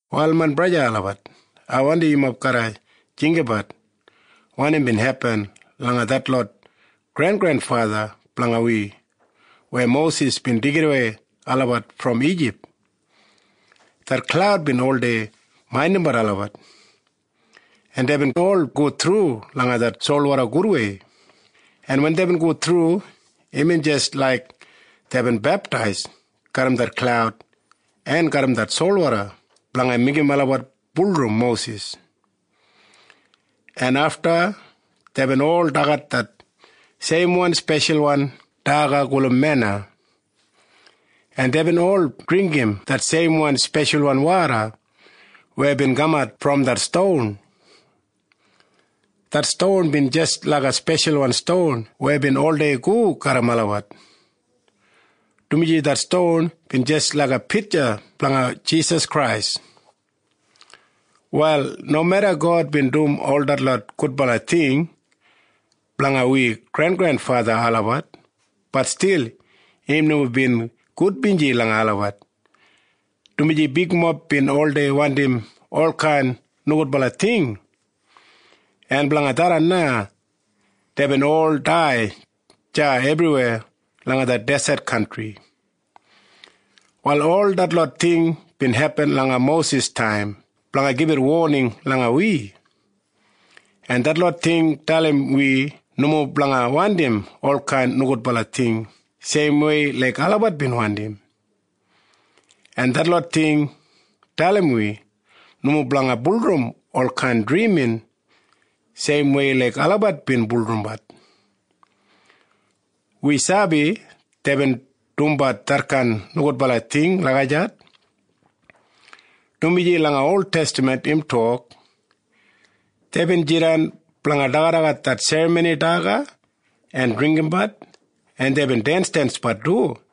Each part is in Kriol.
Wal main braja en sista olabat, ai wandim yumob garra jinggabat wanim bin hepin langa detlot grengrenfatha blanga wi weya Mosis bin deigidawei olabat brom Ijip. Det klaud bin oldei maindimbat olabat, en deibin ol go thru langa det solwoda gudwei, en wen deibin go thru, imbin jis laik deibin beptais garram det klaud en garram det solwoda blanga meigim olabat bulurrum Mosis. En afta deibin ol dagat det seimwan speshalwan daga gulum mena, en deibin ol dringgim det seimwan speshalwan woda weya bin kamat brom det ston. Det ston bin jis laiga speshalwan ston weya bin oldei go garram olabat, dumaji det ston bin jis laiga pitja blanga Jisas Krais. Wal nomeda God bin dum ol detlot gudbala ting blanga wi grengrenfatha olabat, bat stil im nomo bin gudbinji langa olabat, dumaji bigmob bin oldei wandim olkain nogudbala ting, en blanga tharran na deibin ol dai deya ebriweya langa det deset kantri. Wal ol detlot ting bin hepin langa Mosis taim blanga gibit woning langa wi, en detlot ting dalim wi nomo blanga wandim olkain nogudbala ting seimwei laik olabat bin wandim. En detlot ting dalim wi nomo blanga bulurrum olkain drimin seimwei laik olabat bin bulurrumbat. Wi sabi deibin dumbat detkain nogudbala ting lagijat, dumaji langa oltestaman im tok, “Deibin jidan blanga dagadagat det serramoni daga en dringgimbat, en deibin densdensbat du.”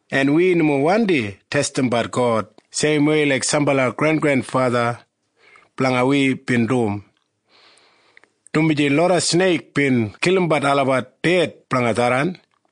En wi nomo wandi testimbat God seimwei laik sambala grengrenfatha blanga wi bin dum, dumaji loda sneik bin kilimbat olabat ded blanga tharran.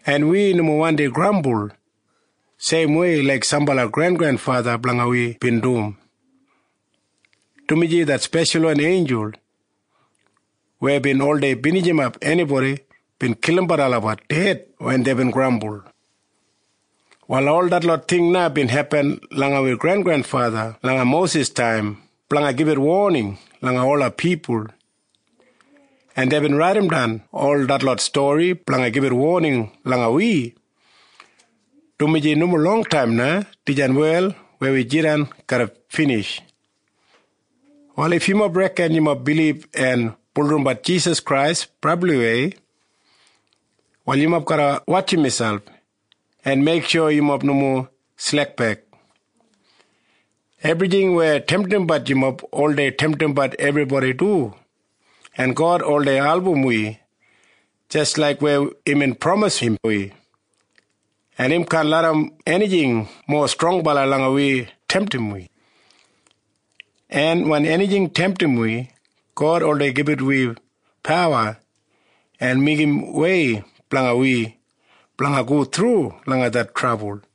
En wi nomo wandi grambul seimwei laik sambala grengrenfatha blanga wi bin dum, dumaji det speshalwan einjul weya bin oldei binijimap enibodi bin kilimbat olabat ded wen deibin grambul. Wal ol detlot ting bin hepin langa wi grengrenfatha langa Mosis taim blanga gibit woning langa ola pipul, en deibin raidimdan ol detlot stori blanga gibit woning langa wi, dumaji nomo longtaim na dijan wel weya wi jidan garra binij. Wal if yumob reken yumob bilib en bulurrumbat Jisas Krais brabliwei, wal yumob garra wotjim miselp en meiksho yumob nomo slekbek. Ebrijing weya temtimbat yumob oldei temtimbat ebribodi du, en God oldei album wi jis laik weya imbin pramisim wi, en im kaan larram enijing mowa strongbala langa wi temtim wi. En wen enijing temtim wi, God oldei gibit wi pawa en meigim wei blanga wi blanga go thru langa det trabul.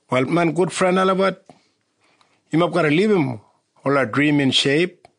Wal main gudfren olabat, yumob garra libum ola drimin sheip.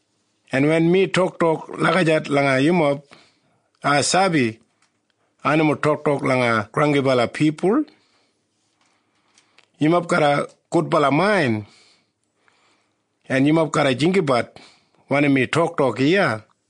En wen mi toktok lagijat langa yumob, ai sabi ai nomo toktok langa granggibala pipul. Yumob garram gudbala main, en yumob garra jinggabat wanim mi toktok iya.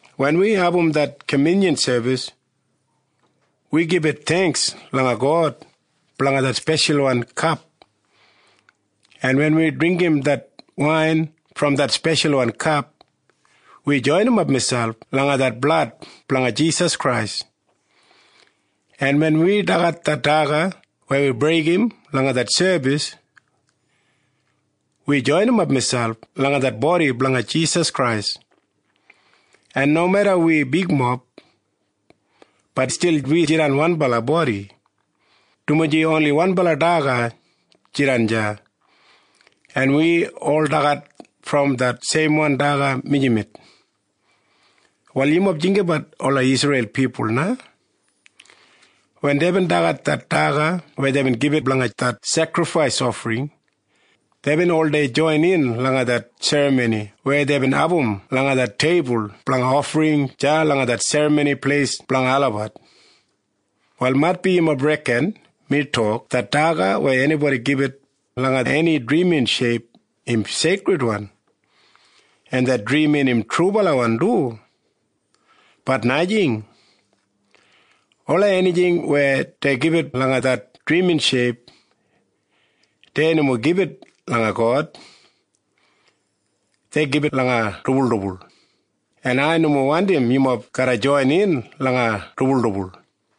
Wen wi abum det kamyunyan sebis, wi gibit theingks langa God blanga det speshalwan kap, en wen wi dringgim det wain brom det speshalwan kap, wi joinimap miselp langa det blad blanga Jisas Krais. En wen wi dagat det daga weya wi breigim langa det sebis, wi joinimap miselp langa det bodi blanga Jisas Krais. En nomeda wi bigmob, bat stil wi jidan wanbala bodi, dumaji oni wanbala daga jidan deya, en wi ol dagat brom det seimwan daga mijamet. Wal yumob jinggabat ola Isreil pipul na. Wen deibin dagat det daga weya deibin gibit blanga det sekrifais ofring, deibin oldei joinin langa det serramoni weya deibin abum langa det teibul blanga ofring deya langa det Serramoni Pleis blanga olabat. Wal maitbi yumob reken mi tok det daga weya enibodi gibit langa eni drimin sheip im seikridwan, en det drimin im trubalawan du. Bat najing. Ola enijing weya dei gibit langa det drimin sheip, dei nomo gibit langa God. Dei gibit langa dibuldibul. En ai nomo wandim yumob garra joinin langa dibuldibul.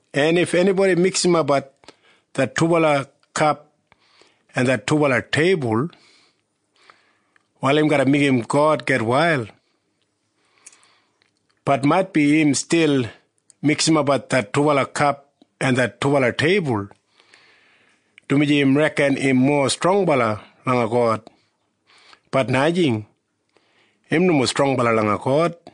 En if enibodi miksimapbat det dubala kap en det dubala teibul, wal im garra meigim God gitwail. Bat maitbi im stil miksimapbat det dubala kap en det dubala teibul, dumaji im reken im mowa strongbala langa God. Bat najing. Im nomo strongbala langa God.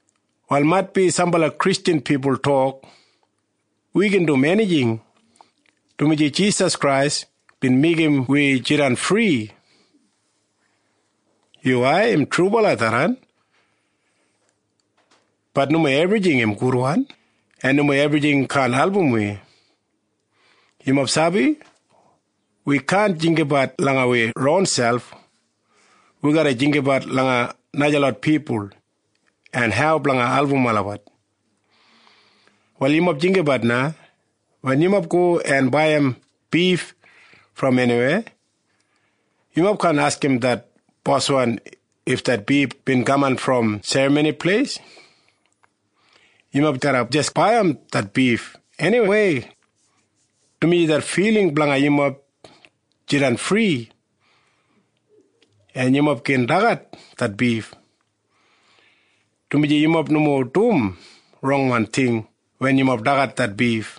Wal maitbi sambala Kristjan pipul tok, “Wi gin dum enijing, dumaji Jisas Krais bin meigim wi jidan fri.” Yuwai. Im trubala tharran. Bat nomo ebrijing gudwan, en nomo ebrijing kaan album wi. Yumob sabi? Wi kaan jinggabat langa wi ronselp. Wi garra jinggabat langa najalot pipul en hau blanga album olabat. Wal yumob jinggabat na. Wen yumob go en baiyim bif brom eniweya, yumob kaan askim det boswan if det bif bin kaman brom serramoni pleis. Yumob garra jis baiyim det bif eniwei, dumaji det filing blanga yumob jidan fri, en yumob gin dagat det bif, dumaji yumob nomo dum rongwan ting wen yumob dagat det bif.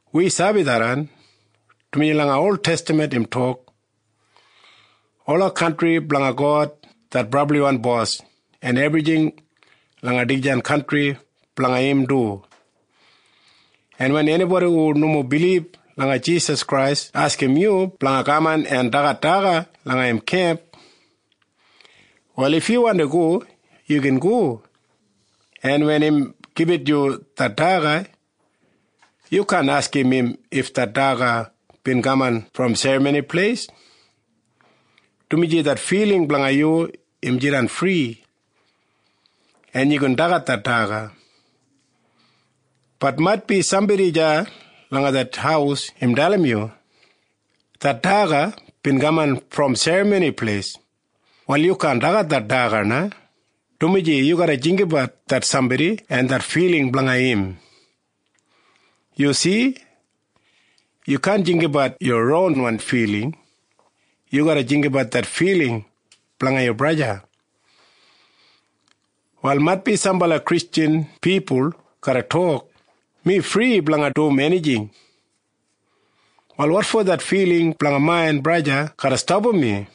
Wi sabi tharran, dumaji langa oltestaman im tok, “Ola kantri blanga God det Brabliwan Bos, en ebrijing langa dijan kantri blanga im du.” En wen enibodi hu nomo bilib langa Jisas Krais askim yu blanga kaman en dagat daga langa im kemp, wal if yu wandi go, yu gin go. En wen im gibit yu det daga, yu kaan askim im if det daga bin kaman brom serramoni pleis, dumaji det filing blanga yu im jidan fri, en yu gin dagat det daga. Bat maitbi sambodi deya langa det haus im dalim yu, “Det daga bin kaman brom serramoni pleis.” Wal yu kaan dagat det daga na, dumaji yu garra jinggabat det sambodi en det filing blanga im. Yu si? Yu kaan jinggabat yu ronwan filing. Yu garra jinggabat det filing blanga yu braja o sista. Wal maitbi sambala Kristjan pipul garra tok, “Mi fri blanga dum enijing. Wal wotfo det filing blanga main braja o sista garra stapam mi?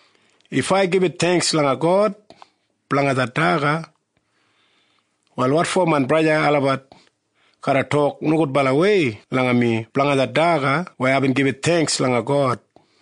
If ai gibit theingks langa God blanga det daga, wal wotfo main braja en sista olabat garra tok nogudbalawei langa mi blanga det daga weya aibin gibit theingks langa God?”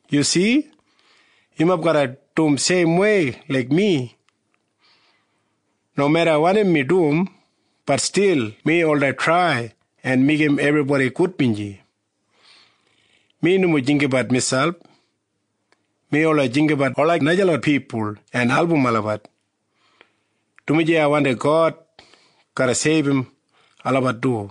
Yu si? Yumob garra dum seimwei laik mi. Nomeda wanim mi dum, bat stil mi oldei trai en meigim ebribodi gudbinji. Mi nomo jinggabat miselp. Mi oldei jinggabat ola najalot pipul en album olabat, dumaji ai wandim God garra seibum olabat du.